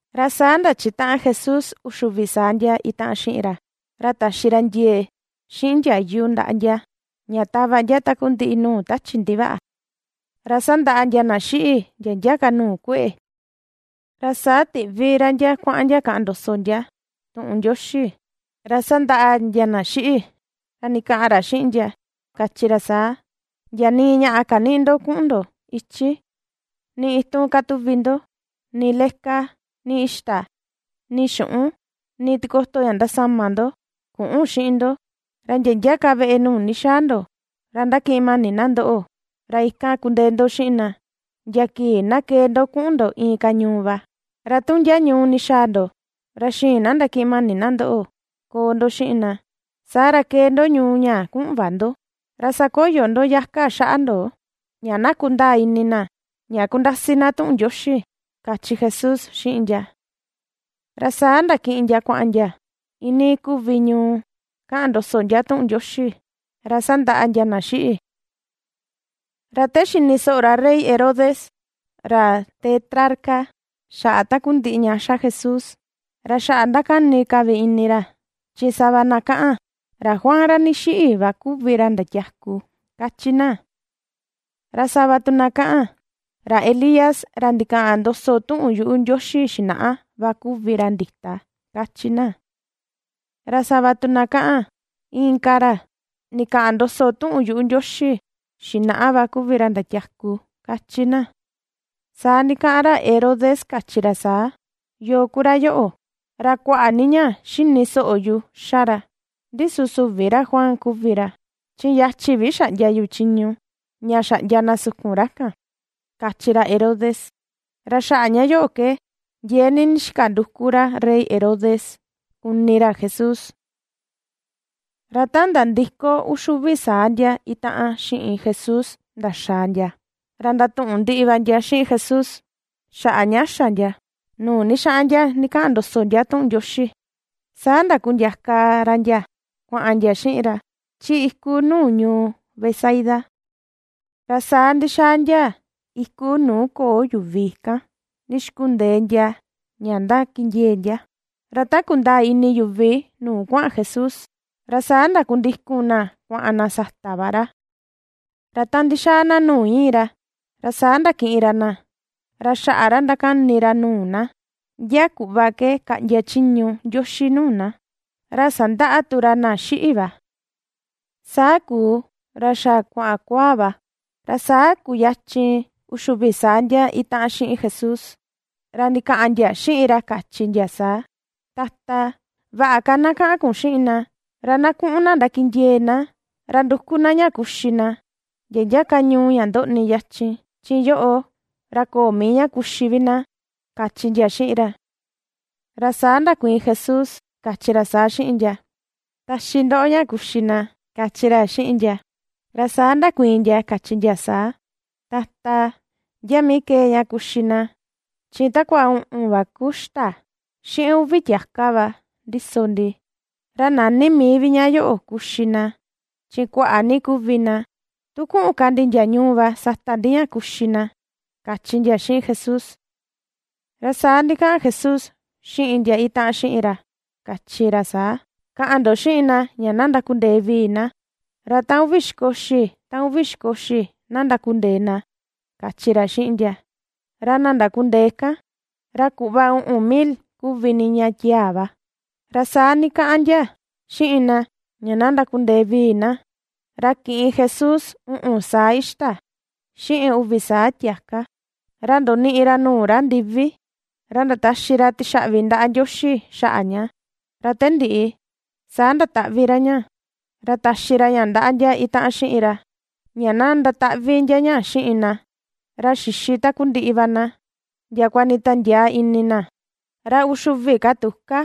Ra saa ndachitaꞌan Jesús uxi uvi saa ndia itaꞌan xiꞌin ra. Ra taxi ra ndie̱e̱ xiꞌin ndiayu ndaꞌa ndia ña tava ndia takundiꞌi nuu tachi ndivaꞌa, ra sandaꞌa ndia na xiꞌi ndia ndia ka nuu kue̱ꞌe̱. Ra saa tiꞌvi ra ndia kuaꞌan ndia kaꞌan ndoso ndia tuꞌun Ndioxi, ra sandaꞌa ndia na xiꞌi. Ra ndikaꞌan ra xiꞌin ndia, kachi ra saa: ―Ndia nii ñaꞌà kanïꞌi ndo kuꞌun ndo ichi, nii itun kätuvi ndo, ni leka, ni ixta, ni xuꞌun, ni tikoto ña ndasama ndo küꞌun xiꞌin ndo. Ra ndia ndia ka veꞌe nuu ndixaa ndo, ra ndakiꞌin mani na ndoꞌo ra ikan kundee ndo xiꞌin na ndia kii na kee ndo kuꞌun ndo inka ñuu va. Ra tu ndia ñuu ndixaa ndo, ra xïin na ndakiꞌin mani na ndoꞌo koo ndo xiꞌin na, saa ra kee ndo ñuu ñaa kuꞌun va ndo. Ra sakoyo ndo yaka xaꞌa ndo ña na kundaa ini na ña ^kundasi na tuꞌun Ndioxi ―kachi Jesús xiꞌin ndia. Ra saa ndakiꞌin ndia kuaꞌan ndia iinii kuvi ñuu kaꞌan ndoso ndia tuꞌun Ndioxi, ra sandaꞌa ndia na xiꞌi. Ta xini soꞌo ra rey Herodes, ra Tetrarca xaꞌa takundiꞌi ña ^xa Jesús, ra xaꞌa ndakani ka vi ini ra, chi sava na kaꞌan: “Ra Juan ra ndixiꞌi va kuvi ra ndatiaku”, kachi na. Ra sava tu na kaꞌan: “Ra Elías ra ndikaꞌan ndoso tuꞌun yuꞌu Ndioxi xinaꞌa va kuvi ra ndita”, kachi na. Ra sava tu na kaꞌan: “Inka ra ndikaꞌan ndoso tuꞌun yuꞌu Ndioxi xinaꞌa va kuvi ra ndatiaku”, kachi na. Saa ndikaꞌan ra Herodes, kachi ra saa: ―¿Yoo ku ra yoꞌo? Ra kuaꞌa ni ña xini soꞌo yu ^xa ra. Ndi süvi ra Juan kuvi ra chi yachi vi xaꞌndia yu chiñu ña xaꞌndia na sukun ra kan ―kachi ra Herodes. Ra xaꞌa ña yoꞌo ke ndiee ni ndixika nduku ra Rey Herodes kuni ra Jesús. Ra ta nandiko uxi uvi saa ndia itaꞌan xiꞌin Jesús ndaxaa ndia, ra ndatuꞌun ndiꞌi va ndia xiꞌin Jesús xaꞌa ña xa ndia nuu ndixaꞌan ndia ndikaꞌan ndoso ndia tuꞌun Ndioxi. Saa ndakundiaka ra ndia kuaꞌan ndia xiꞌin ra chi iku nuu ñuu Betsaida. Ra saa ndixaa ndia iku nuu köo yuvi kan ndixkundee ndia ña ndakindiee ndia. Ra ta kundaa ini yuvi nuu kuaꞌan Jesús, ra saa ndakundikun na kuaꞌan na sata va ra. Ra ta ndixaa na nuu iin ra, ra saa ndakiꞌin ra na, ra xaꞌa ra ndakani ra nuu na ndia kuꞌva ke kaꞌndia chiñu Ndioxi nuu na. Ra sandaꞌa tu ra na xiꞌi va. Saa kuu, ra xa kuaꞌan kuaa va, ra saa kuyachin uxi uvi saa ndia itaꞌan xiꞌin Jesús ra ndikaꞌan ndia xiꞌin ra, kachi ndia saa: ―Tata, vaꞌa ka na kaꞌan kun xiꞌin na, ra na kuꞌun na ndakindiee na, ra nduku na ña kuxi na ndia ndia ka ñuu ña ndoꞌni yachin. Chi yoꞌo ra köo mii vi ña kuxi na ―kachi ndia xiꞌin ra. Ra saa ndakuiin Jesús, kachi ra saa xiꞌin ndia: ―Taxi ndoꞌo ña kuxi na ―kachi ra xiꞌin ndia. Ra saa ndakuiin ndia, kachi ndia saa: ―Tata, ¿ndia mii kee ña kuxi na? Chi takua uꞌun va ku ixta, xiꞌin uvi tiaka va ndiso ndi. Ra näni mii vi ña yoꞌo kuxi na chi kuaꞌa ni kuvi na. Tu kuꞌun ka ndi ndia ñuu va sata ndi ña kuxi na ―kachi ndia xiꞌin Jesús. Ra saa ndikaꞌan Jesús xiꞌin ndia itaꞌan xiꞌin ra, kachi ra saa: ―Kaꞌan ndo xiꞌin na ña na ndakundee vii na, ra ta uvi xikoxi ta uvi xikoxi na ndakundee na ―kachi ra xiꞌin ndia. Ra na ndakundee kan, ra kuꞌva uꞌun mil kuvi niña tiaa va. Ra saa ndikaꞌan ndia xiꞌin na ña na ndakundee vii na. Ra kiꞌin Jesús uꞌun saa ixta xiꞌin uvi saa tiaka, ra ndoniꞌi ra nuu ra ndivi ra ndataxi ra tixaꞌvi ndaꞌa Ndioxi xaꞌa ña. Ra te ndiꞌi saa ndataꞌvi ra ña, ra taxi ra ña ndaꞌa ndia itaꞌan xiꞌin ra, ña na ndataꞌvi ndia ña xiꞌin na. Ra xixi takundiꞌi va na ndiakua nditiandiaa ini na. Ra uxi uvi ka tuka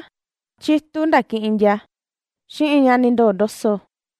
chitu ndakiꞌin ndia xiꞌin ña ndindoo ndoso.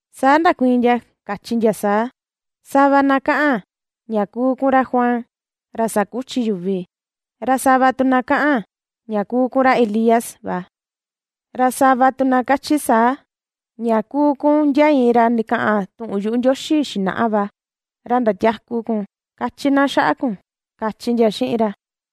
Saa ndakuiin ndia, kachi ndia saa: ―Sava na kaꞌan ña kuu kun ra Juan ra sakuchi yuvi; ra sava tu na kaꞌan ña kuu kun ra Elías va; ra sava tu na kachi saa ña kuu kun ndia iin ra ndikaꞌan tuꞌun yuꞌu Ndioxi xinaꞌa va, ra ndatiaku kun, kachi na xaꞌa kun ―kachi ndia xiꞌin ra.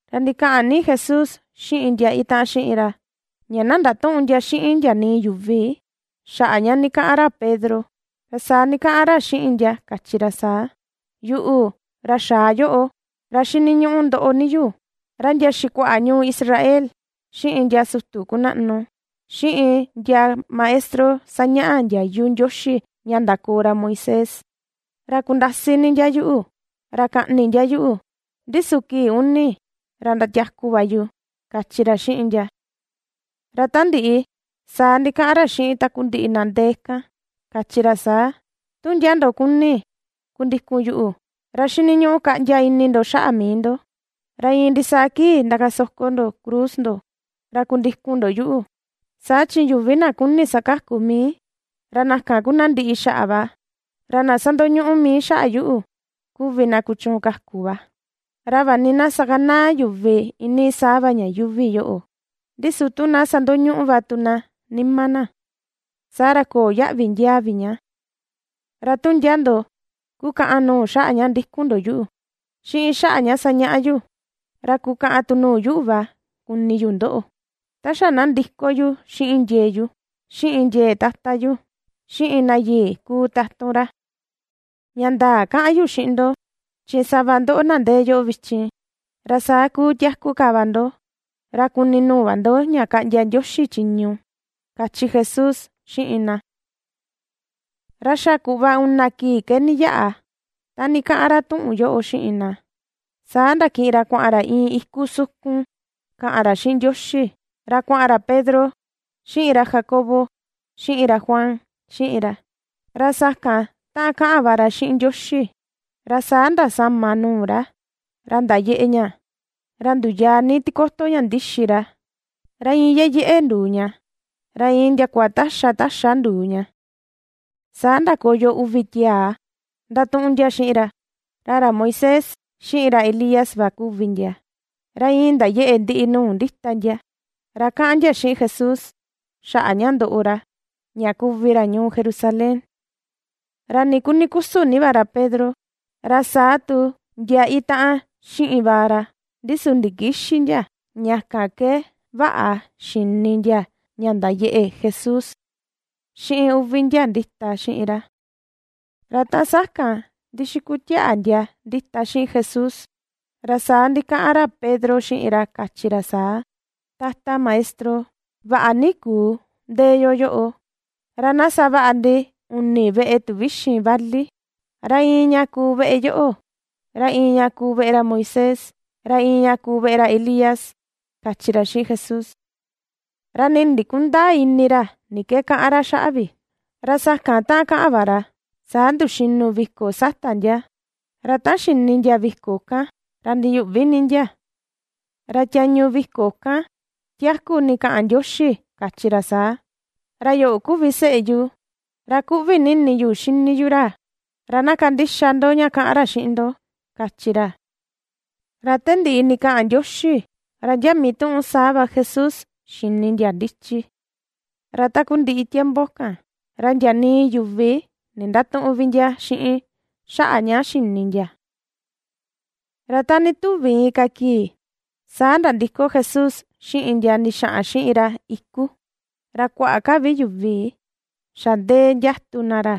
Ra ndikaꞌan ni Jesús xiꞌin ndia itaꞌan xiꞌin ra, ña na ndatüꞌun ndia xiꞌin ndia nii yuvi xaꞌa ña ndikaꞌan ra Pedro. Ra saa ndikaꞌan ra xiꞌin ndia, kachi ra saa: ―Yuꞌu, ra xaa yoꞌo, ra xiniñuꞌu ndoꞌo ni yu, ra ndia xikuaꞌa ñuu Israel, xiꞌin ndia sutu kunaꞌnu, xiꞌin ndia maestro sañaꞌa ndiayu Ndioxi ña ndakoo ra Moisés, ra kundasi ni ndia yuꞌu, ra kaꞌni ndia yuꞌu, ndi su kii ña uni ra ndatiaku va yu ―kachi ra xiꞌin ndia. Ra ta ndiꞌi, saa ndikaꞌan ra xiꞌin takundiꞌi na ndee kan, kachi ra saa: ―Tu ndia ndo kuni kundikun yuꞌu, ra xiniñuꞌu kaꞌndia ini ndo xaꞌa mii ndo; ra iin ndisaa kii ndakasoko ndo cruz ndo, ra kundikun ndo yuꞌu. Saa chi yuvi na kuni sakaku mii, ra na kan ku na ndiꞌi xaꞌa va; ra na sandoñuꞌu mii xaꞌa yuꞌu, kuvi na kuchuun kaku va. Ra vaꞌa ni na sakanaa yuvi iinii saa va ña yuuvi yoꞌo, ndi su tu na sandoñuꞌu va tu na nima na, saa ra köo yaꞌvi ndiaa vi ña. Ra tu ndia ndo kukaꞌan nuu xaꞌa ña ndikun ndo yuꞌu, xiꞌin xaꞌa ña sañaꞌa yu, ra kukaꞌan tu nuu yuꞌu va kuni yu ndoꞌo ta xa na ndiko yu xiꞌin ndie̱e̱ yu, xiꞌin ndie̱e̱ Tata yu, xiꞌin na yii na kuu tatun ra. Ña ndaa kaꞌan yu xiꞌin ndo, chi sava ndoꞌo na ndee yoꞌo vichin, ra saa kuu tiaku ka va ndo, ra kuni nuu va ndo ña kaꞌndia Ndioxi chiñu ―kachi Jesús xiꞌin na. Ra xa kuꞌva una kii ke ndiyaꞌa ta ndikaꞌan ra tuꞌun yoꞌo xiꞌin na. Saa ndakiꞌin ra kuaꞌan ra iin iku sukun kaꞌan ra xiꞌin Ndioxi, ra kuaꞌan ra Pedro, xiꞌin ra Jacobo, xiꞌin ra Juan xiꞌin ra. Ra sakan ta kaꞌan va ra xiꞌin Ndioxi, ra saa ndasama nuu ra, ra ndayeꞌe ña, ra nduyaa ni tikoto ña ndixi ra, ra iin yeyeꞌe nduu ña, ra iin ndiakua taxa taxa nduu ña. Saa ndakoyo uvi tiaa ndatuꞌun ndia xiꞌin ra. Ra ra Moisés, xiꞌin ra Elías va kuvi ndia. Ra iin ndayeꞌe ndiꞌi nuu ndita ndia, ra kaꞌan ndia xiꞌin Jesús, xaꞌa ña ndoꞌo ra, ña kuvi ra ñuu Jerusalén. Ra nii kuni kusun ni va ra Pedro, ra saa tu ndia itaꞌan xiꞌin va ra, ndi su ndikïxi ndia. Ña kan ke vaꞌa xini ndia ña ndayeꞌe Jesús, xiꞌin uvi ndia ndita xiꞌin ra. Ra ta sakan ndixikutiaꞌa ndia ndita xiꞌin Jesús; ra saa ndikaꞌan ra Pedro, xiꞌin ra kachi ra saa: ―Tata Maestro, vaꞌa ni kuu ndee yo yoꞌo. Ra na savaꞌa ndi uni veꞌe tuvixin vali, ra iin ña kuu veꞌe yoꞌo, ra iin ña kuu veꞌe ra Moisés, ra iin ña kuu veꞌe ra Elías ―kachi ra xiꞌin Jesús. Ra nii ndikundäa ini ra ni ke kaꞌan ra xaꞌa vi. Ra sakan ta kaꞌan va ra, saa nduxinu viko sata ndia. Ra ta xini ndia viko kan ra ndiyuꞌvi ni ndia. Ra tiañu viko kan tiaku ndikaꞌan Ndioxi, kachi ra saa: ―Ra yoꞌo kuvi seꞌe yu, ra kuꞌvi ni ini yu xini yu ra. Ra na kandixa ndo ña kaꞌan ra xiꞌin ndo ―kachi ra. Ra ta ndiꞌi ndikaꞌan Ndioxi, ra ndia mituꞌun saa va Jesús xini ndia ndichi. Ra takundiꞌi tiempo kan ra ndia nii yuvi ndindatüꞌun ndia xiꞌin xaꞌa vi ña xini ndia. Ra ta ndituvi inka kii, saa nandiko Jesús xiꞌin ndia ndixaꞌan xiꞌin ra iku. Ra kuaꞌa ka vi yuvi xa ndee ndiatun na ra.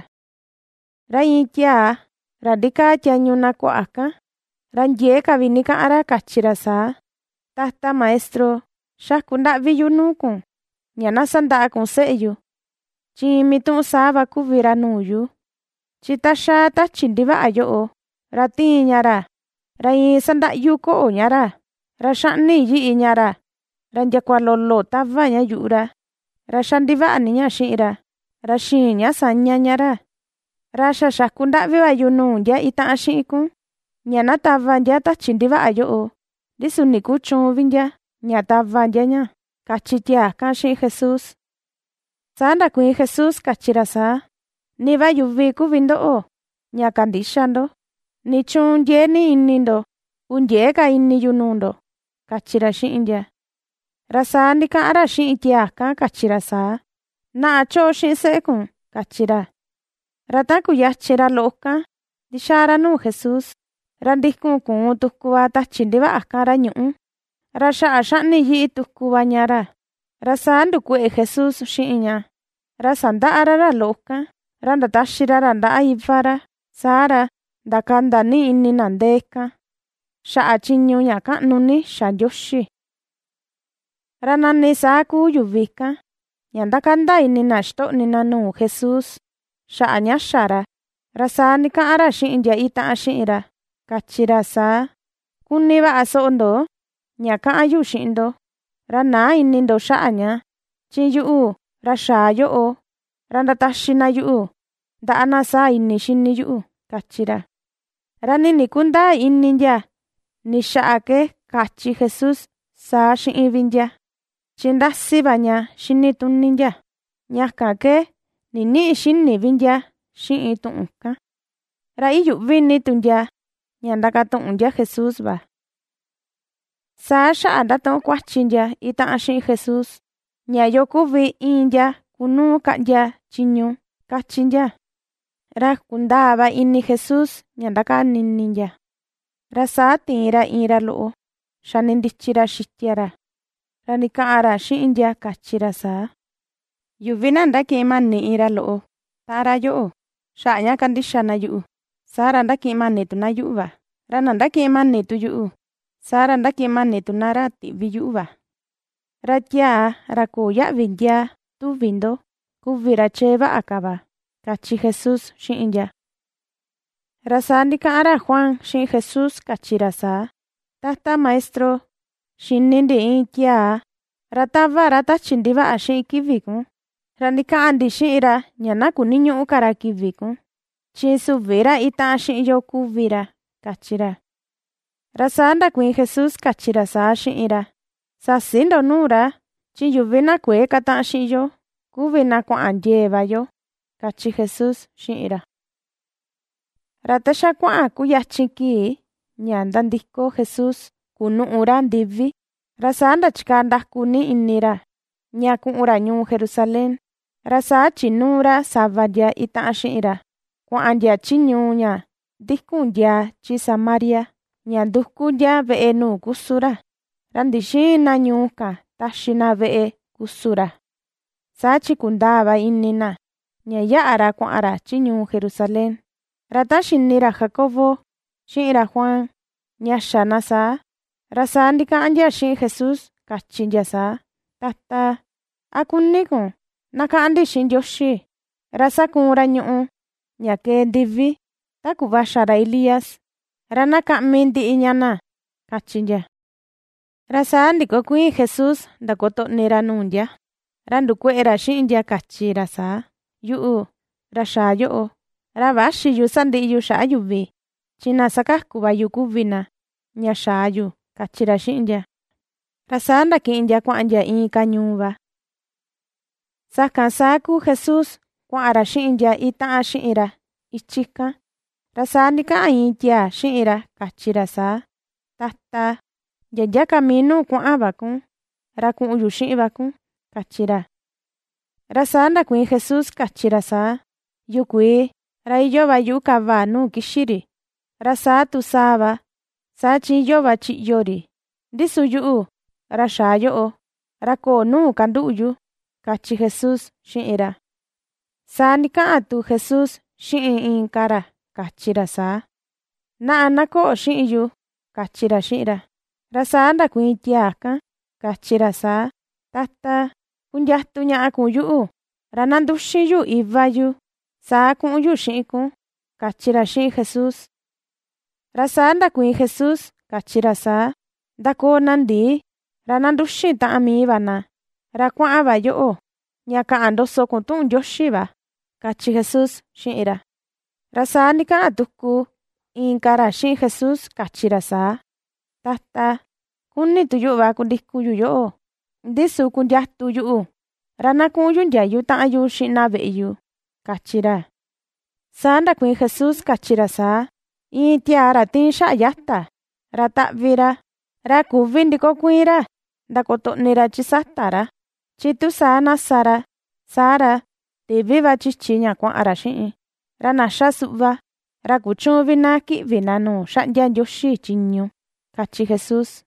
Ra iin tiaa ra ndikaa tiañu na kuaꞌa kan, ra ndiee ka vi ndikaꞌan ra, kachi ra saa: ―Tata Maestro, xaku ndaꞌvi yu nuu kun, ña na sandaꞌa kun seꞌe yu, chi iin mituꞌun saa va kuvi ra nuu yu. Chi ta xaa tachi ndivaꞌa yoꞌo, ra tiin ña ra, ra iin sandaꞌyu koꞌo ña ra, ra xaꞌni yiꞌi ña ra ndiakua lolo tava ña yuꞌu ra. Ra xa ndivaꞌa ni ña xiꞌin ra, ra xïin ña saña ña ra. Ra xa xaku ndaꞌvi va yu nuu ndia itaꞌan xiꞌin kun, ña na tava ndia tachi ndivaꞌa yoꞌo, ndi su ndikuchüun vi ndia ña tava ndia ña ―kachi tiaa kan xiꞌin Jesús. Saa ndakuiin Jesús, kachi ra saa: ―Ni va yuvi kuvi ndoꞌo ña kandïxa ndo. ¿Nichuun ndiee ni ini ndo? Kundiëe ka ini yu nuu ndo ―kachi ra xiꞌin ndia. Ra saa ndikaꞌan ra xiꞌin tiaa kan, kachi ra saa: ―Naꞌa choꞌo xiꞌin seꞌe kun ―kachi ra. Ra ta kuyachin ra loꞌo kan ndixaa ra nuu Jesús, ra ndikun kuun tuku va tachi ndivaꞌa kan ra ñuꞌu, ra xaꞌa xaꞌni yiꞌi tuku va ña ra. Ra saa ndukueꞌe Jesús xiꞌin ña, ra sandaꞌa ra ra loꞌo kan, ra ndataxi ra ra ndaꞌa iva ra. Saa ra, ndakanda ni ini na ndee kan, xaꞌa chiñu ña kaꞌnu ni ña xa Ndioxi. Ra nani saa kuu yuvi kan, ña ndakanda ini na ixtoꞌni na nuu Jesús xaꞌa ña xa ra. Ra saa ndikaꞌan ra xiꞌin ndia itaꞌan xiꞌin ra, kachi ra saa: ―Kuni vaꞌa soꞌo ndo, ña kaꞌan yu xiꞌin ndo, ra näa ini ndo xaꞌa ña. Chi yuꞌu, ra xaa yoꞌo, ra ndataxi na yuꞌu ndaꞌa na saa ini xini yuꞌu ―kachi ra. Ra nii ndikundäa ini ndia ni xaꞌa ke kachi Jesús saa xiꞌin vi ndia. Chi ^ndasi va ña xini tuni ndia, ña kan ke ndinïꞌi xini ndia xiꞌin vi tuꞌun kan. Ra iyuꞌvi ni tu ndia ña ndakatuꞌun ndia Jesús va. Saa xaꞌa ndatuꞌun kuachi ndia itaꞌan xiꞌin Jesús, ña yo kuvi iin ndia kunuu kaꞌndia chiñu, kachi ndia. Ra kundaa va ini Jesús ña ndakani ini ndia. Ra saa tiin, ra iin ra loꞌo xani ndichi ra xitia ra. Ra ndikaꞌan ra xiꞌin ndia, kachi ra saa: ―Yuvi na ndakiꞌin mani iin ra loꞌo taꞌan ra yoꞌo xaꞌa ña kandixa na yuꞌu, saa ra ndakiꞌin mani tu na yuꞌu va; ra na ndakiꞌin mani tu yuꞌu, saa ra, ndakiꞌin mani tu na ra tiꞌvi yuꞌu va. Ra tiaa ra köo yaꞌvi ndiaa, tuvi ndo, kuvi ra chee vaꞌa ka va ―kachi Jesús xiꞌin ndia. Ra saa ndikaꞌan ra Juan xiꞌin Jesús kachi ra saa: ―Tata Maestro, xini ndi iin tiaa, ra tava ra tachi ndivaꞌa xiꞌin kivi kun. Ra ndikaꞌan ndi xiꞌin ra, ña na kuniñüꞌu ka ra kivi kun, chi süvi ra itaꞌan xiꞌin yo kuvi ra ―kachi ra. Ra saa ndakuiin Jesús, kachi ra saa xiꞌin ra: ―Säsi ndo nuu ra, chi yuvi na kuëe kataꞌan xiꞌin yo, kuvi na kuaꞌan ndie̱e̱ va yo ―kachi Jesús xiꞌin ra. Ra ta xa kuaꞌan kuyachin kii ña nandiko Jesús kunuꞌu ra ndivi, ra saa ndachikaa ndaku ni ini ra ña kuꞌun ra ñuu Jerusalén. Ra saa chinuu ra sava ndia itaꞌan xiꞌin ra, kuaꞌan ndia chi ñuu ña ndikun ndiaa chi Samaria, ña nduku ndia veꞌe nuu kusun ra. Ra ndixïin na ñuu kan taxi na veꞌe kusun ra, saa chi kundaa va ini na ña yaꞌa ra kuaꞌan ra chi ñuu Jerusalén. Ra ta xini ra Jacobo xiꞌin ra Juan ña xa na saa, ra saa ndikaꞌan ndia xiꞌin Jesús, kachi ndia saa: ―Tata, ¿a kuni kun na kaꞌan ndi xiꞌin Ndioxi, ra sakuun ra ñuꞌu ña kee ndivi ta kuꞌva xa ra Elías, ra na kaꞌmi ndiꞌi ña na? ―kachi ndia. Ra saa ndikokuiin Jesús ndakotoꞌni ra nuu ndia, ra ndukueꞌe ra xiꞌin ndia, kachi ra saa: ―Yuꞌu, ra xaa yoꞌo, ra växi yu sandiꞌi yu xaꞌa yuvi, chi na sakaku va yu kuvi na, ña xaa yu ―kachi ra xiꞌin ndia. Ra saa ndakiꞌin ndia kuaꞌan ndia inka ñuu va. Sakan saa kuu Jesús kuaꞌan ra xiꞌin ndia itaꞌan xiꞌin ra ichi kan, ra saa ndikaꞌan iin tiaa xiꞌin ra, kachi ra saa: ―Tata, ndia ndia ka mii nuu kuaꞌan va kun, ra kuꞌun yu xiꞌin va kun ―kachi ra. Ra saa ndakuiin Jesús, kachi ra saa: ―Yukuii, ra iyoo va yuꞌu kava nuu kixi ri, ra saa tu sàà va, saa chi iyoo va chiꞌyo ri. Ndi su yuꞌu, ra xaa yoꞌo, ra köo nuu kanduꞌu yu ―kachi Jesús xiꞌin ra. Saa ndikaꞌan tu Jesús xiꞌin inka ra kachi ra saa: ―Naꞌa, na koꞌo xiꞌin yu ―kachi ra xiꞌin ra. Ra saa ndakuiin tiaa kan, kachi ra saa: ―Tata, kundiatu ñaꞌa kun yuꞌu, ra na nduxin yu iva yu. Saa kuꞌun yu xiꞌin kun ―kachi ra xiꞌin Jesús. Ra saa ndakuiin Jesús, kachi ra saa: ―Ndakoo na ndii, ra na nduxin taꞌan mii va na. Ra kuaꞌan va yoꞌo, ña kaꞌan ndoso kun tuꞌun Ndioxi va ―kachi Jesús xiꞌin ra. Ra saa ndikaꞌan tuku inka ra xiꞌin Jesús kachi ra saa: ―Tata, kuni tu yuꞌu va kundikun yu yoꞌo. Ndi su kundiatu yuꞌu, ra na kuꞌun yu ndiayu taꞌan yu xiꞌin na veꞌe yu ―kachi ra. Saa ndakuiin Jesús, kachi ra saa: ―Iin tiaa ra tiin xaꞌa yata, ra taꞌvi ra, ra küvi ndikokuiin ra ndakotoꞌni ra chi sata ra, chi tu saa na sa ra, saa ra, tivi va chichi ña kuaꞌan ra xiꞌin. Ra na ^xa suꞌva, ra kuchüun vi na kiꞌvi na nuu xaꞌndia Ndioxi chiñu ―kachi Jesús.